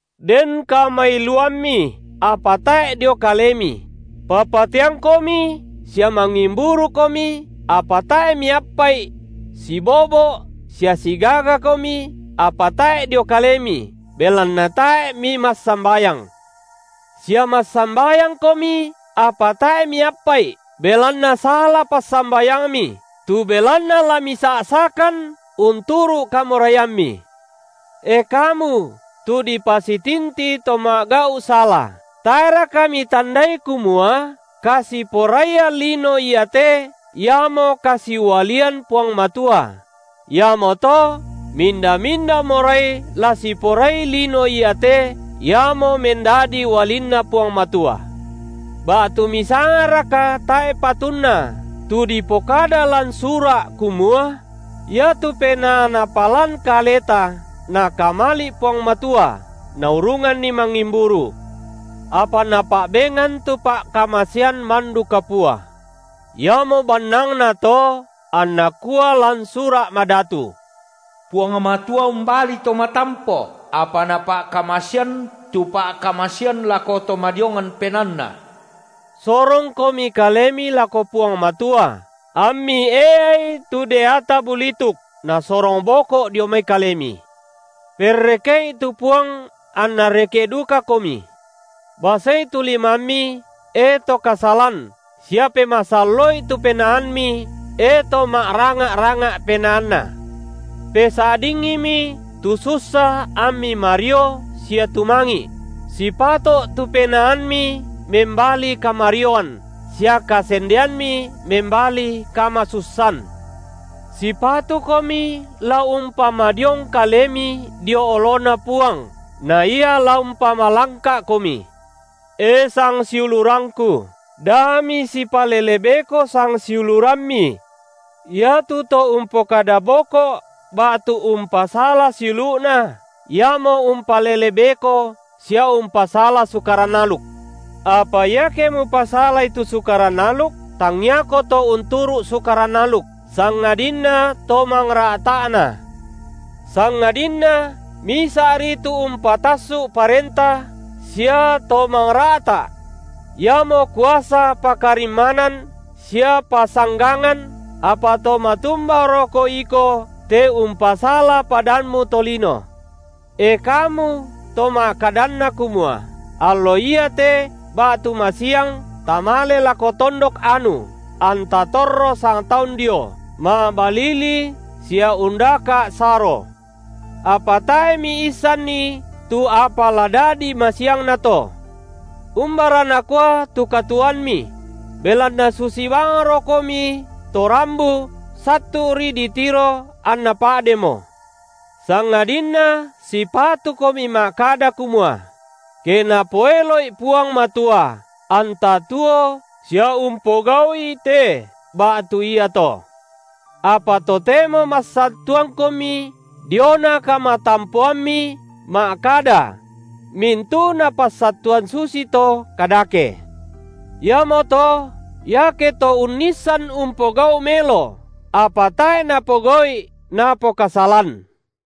Den kamailuammi, apa tae’ dio kalemi; papateangkomi sia mangimburukomi, apa tae’ miappa’i; sibobo’ sia sigagakomi, apa tae’ dio kalemi, belanna tae’ mimassambayang; sia massambayangkomi, apa tae’ miappa’i, belanna sala passambayangmi, tu belanna la misa’sakan unturu’ kamoraiammi. E kamu tu dipasitinti to ma’gau’ sala, tae’raka mitandai kumua kasiporaian lino iate, iamo kasiualian Puang Matua? Iamoto minda-minda morai la siporai lino iate, iamo mendadi ualinNa Puang Matua. Ba’tu misangaraka tae’ patunna tu dipokada lan Sura’ kamua: iatu penaa Napalan kaleta Nakamali’ Puang Matua, Naurunganni mangimburu? Apa Napa’bengan tu pa’kamasean mandu kapua. Iamo bannangna to anna kua lan Sura’ Madatu: Puang Matua umbali to matampo, apa Napa’kamasean tu pa’kamasean lako to madiongan penaanna. Sorongkomi kalemi lako Puang Matua, ammi eai tu deata bulituk, nasorong boko’ dio mai kalemi. Perreke’i tu Puang anNa reke’ dukakomi. Basei tu limammi, e to kasalan, sia pemasallo’i tu penaammi, e to ma’ranga’-ranga’ penaanna. Pesa’dingimi tu sussa ammi mario sia tumangi’; sipato’ tu penaammi membali kamarioan, sia kasendeammi membali kamasussan. Sipatukomi la umpamadiong kalemi dio oloNa Puang, na Ia la umpamalangka’komi. E sangsiulurangku, da misipalele beko sangsiulurammi. Iatu to umpokada boko’ ba’tu umpasala siulu’na, iamo umpalele beko sia umpasala sukaran aluk. Apa iake mupasalai tu Sukaran aluk, tangiako to unturu’ Sukaran aluk, sangadinna to mangra’ta’na. Sangadinna Misa’ri tu Umpatassu’ parenta sia To mangra’ta’. Iamo kuasa pakarimmanan sia pasanggangan, apa to matumbaroko iko te umpasala padammu tolino? E kamu to ma’kadanna kumua: Allo iate ba’tu masiang tamale lako tondok anu anta torro sangtaun dio, ma’balili sia undaka’ saro; apa tae’ miissanni tu apa la dadi masiangna to. Umbara nakua tu katuoammi? Belanna susi bangrokomi to rambu, sattu’ri ditiro, anna pa’demo. Sangadinna sipatukomi ma’kada kumua: Ke Napoelo’i Puang Matua, anta tuo sia umpogau’i te ba’tu iato. Apa totemo massattuangkomi diona kamatampoammi ma’kada; mintu’na passattuan susito kadake. Iamoto, iake to unnissan umpogau’ melo, apa tae’ napogau’i napokasalan.